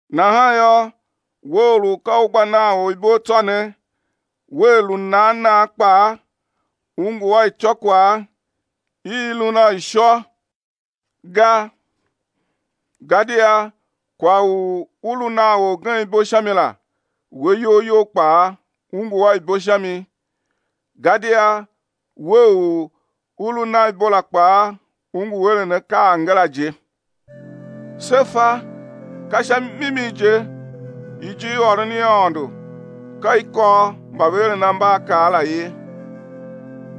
Nahan yô, we or u ka u gba nan or ibo tsô ne, wea lu nan nan kpaa u ngu a ityôkwagh i lun a ishô ga gadia kwagh u u lu nan orgen ibo sha mi la, we iyol you kpaa u ngu a ibo sha mi, gadia we u u lu nan ibo la kpaa u ngu eren akaa angara je. Se fa ka sha mimi je ijirôron i Aôndo ka i kôr mba ve eren ambaakaa la ye.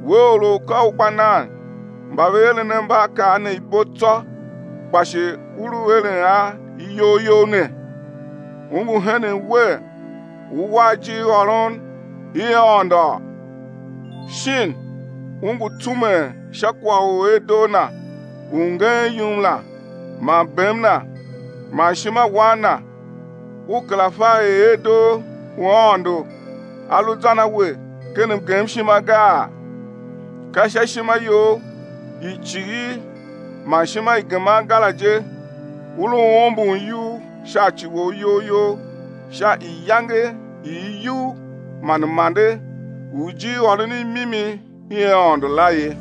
We or u ka u gba nan mba ve eren ambaakaa ne ibo tsô, kpa shi u lu eren a iyol you ne, u ngu henen wer ú war ijirôron i Aôndo? Shin u ngu tsumen sha kwagh u erdoo Na u ngeen yum la man bem Na man ishimawan Na; u kera fa er erdoo u Aôndo a lu zan a we ken mgemshima gaa? Ka sha ishima you i cighir man ishima i geman ga la je u lu ombon iyugh sha ci wou iyol you sha iyange i iyugh man m-ande u ijirôron i mimi i Aôndo la ye.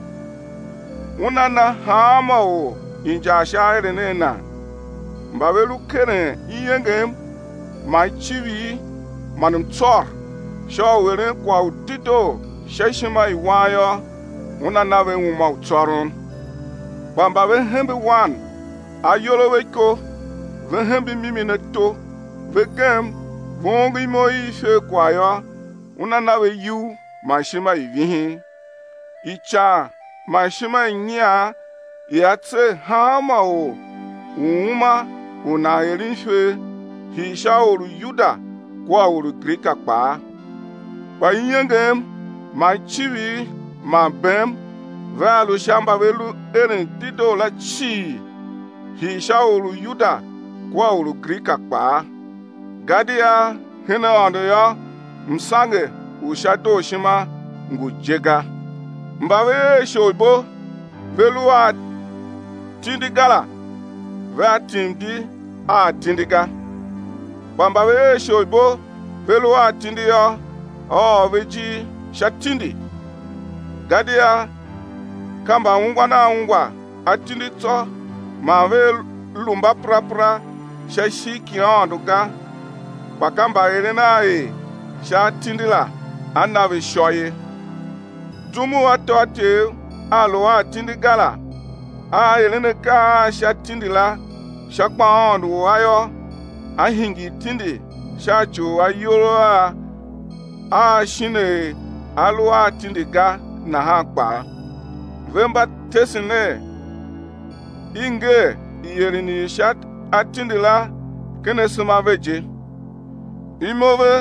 Una na hanma or injar sha aeren a nan. Mba ve lu keren iengem man icivir man mtsôr sha u eren kwagh u dedoo sha ishima i wan yô, Una na ve uma u tsôron. Kpa mba ve hembe wan ayol a ve iko, ve hembe mimi ato ve gem ve ongo imo i iferkwagh yô, Una na ve iyugh man ishima i vihin. Ican man ishima i nyian ia tser hanma or u uma u nan eren ifer, hii sha or u Yuda kua or u Grika kpaa. Kpa iengem man icivir man bem vea lu sha mba ve lu eren dedoo la cii, hii sha or u Yuda kua or u Grika kpaa. Gadia hen Aôndo yô, msange u sha dooshima ngu je ga. Mba ve er isholibo, ve lu a atindi ga la, vea tim di a atindi ga. Kpa mba ve er isholibo ve lu a atindi yô, á ôr ve ijir sha tindi. Gadia ka mbaungwan a ungwa atindi tsô man vea lu mbaperapera sha ishigh ki Aôndo ga, kpa ka mbaeren a er sha atindi la á na ve ishô ye. Zum u atôatyev a a lu a atindi ga la aa eren akaa a sha tindi la sha gbaaôndo u a yô, á hingir tindi sha ci u ayol a a shin er a lu a atindi ga nahan kpaa. Ve mba tesen er i nger ieren i sha atindi la ken asema a ve je. Imo ve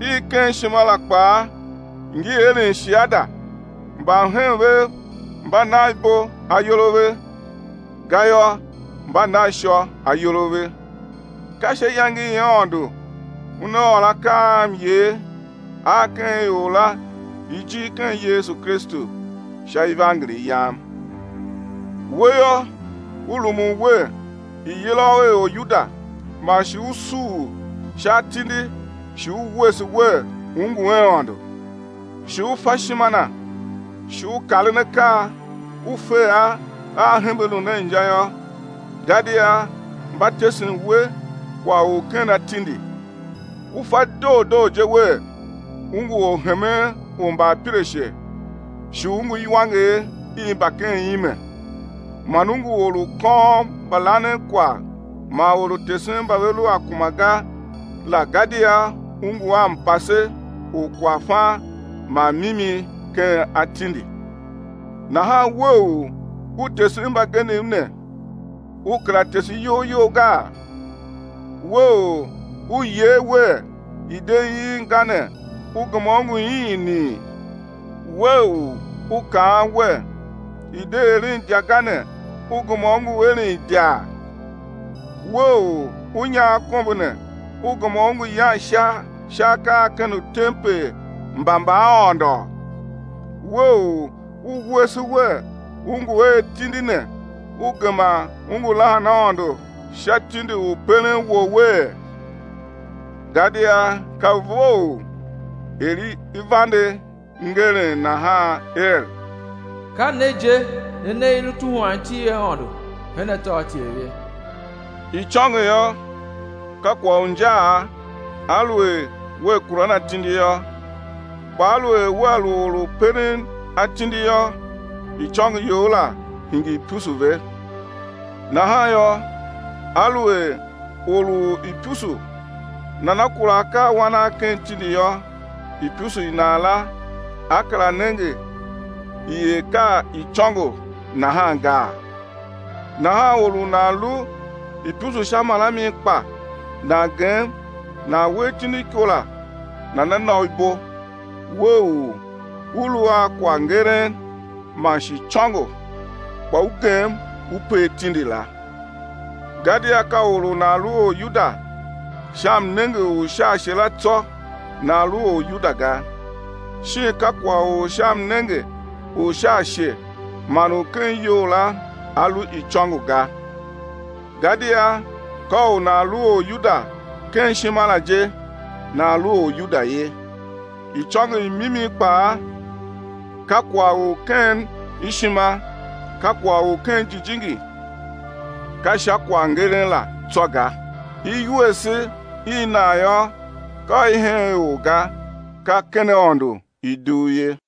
i ken ishima la kpaa ngi eren shiada, mbamhen vev mba nan ibo ayol a ve, gayô, mba nan ishô ayol a ve, ka sha iyange i Aôndo Una ôr akaa a myer a ken ior la ijir ken Yesu Kristu sha ivangeli yam. We yô, u rumun wer i̱ yila u er Oryuda man shi u suur sha atindi shi u wuese wer u ngu a Aôndo, shi u fa ishima Na, shi u karen akaa, u fe a a hembe lun a inja yô, gadia mba tesen we kwagh u ken atindi. U fa doo doo je wer u ngu orhemen u mbaapirashe shi u ngu iwanger i mba ken ime man u ngu or u kôôm mbalanenkwagh man or u tesen mba ve lu a kuma ga la gadia u ngu a mpase u kwaghfan man mimi ken atindi. Nahan we u u tesen mbagenev ne u kera tese iyol you gaa? We u u yee wer, i̱ de iin ga ne, u gema u ngu iini? We u u kaan wer, i̱ de eren idya ga ne, u gema u ngu eren idya? We u u nyagh akombo ne, u gema u ngu yan ishar sha akaa a ken utempel mba mbaaôndo? We u u wuese wer u ngu a atindi ne u gema u ngu lahan Aôndo sha tindi u peren wouwee? Gadia ka vough er i vande ngeren nahan er: Ka ne je ne ne i lu tuhwan iti i Aôndo hen atôatyev ye. Icôngo yô, ka kwagh u injaa aluer wea kuran atindi yô, kpa aluer wea lu or u peren atindi yô, icôngo you la hingir ipusu ve. Nahan yô, aluer or u ipusu nana kura akaawan a ken tindi yô, ipusu i nan la á kera nenge i er ka icôngo nahan gaa? Nahan or u nan lu ipusu sha marami kpa nan gem nan we atindi iko la nana na u ibo, we u u lu a kwaghngeren man shi icôngo, kpa u gem u per tindi la. Gadia ka or u nan lu Oryuda sha mnenge u sha ashe la tsô nan lu Oryuda ga, shin ka kwagh u sha mnenge u sha ashe man u ken iyol la a lu icôngo ga. Gadia ka u nan lu Oryuda ken ishima la je nan lu Oryuda ye, icôngo i mimi kpaa, ka kwagh u ken ishima, ka kwagh u ken jijingi, ka sha kwaghngeren la tsô ga. Iwuese i nan yô, ka i hen ior ga, ka ken Aôndo i dugh ye.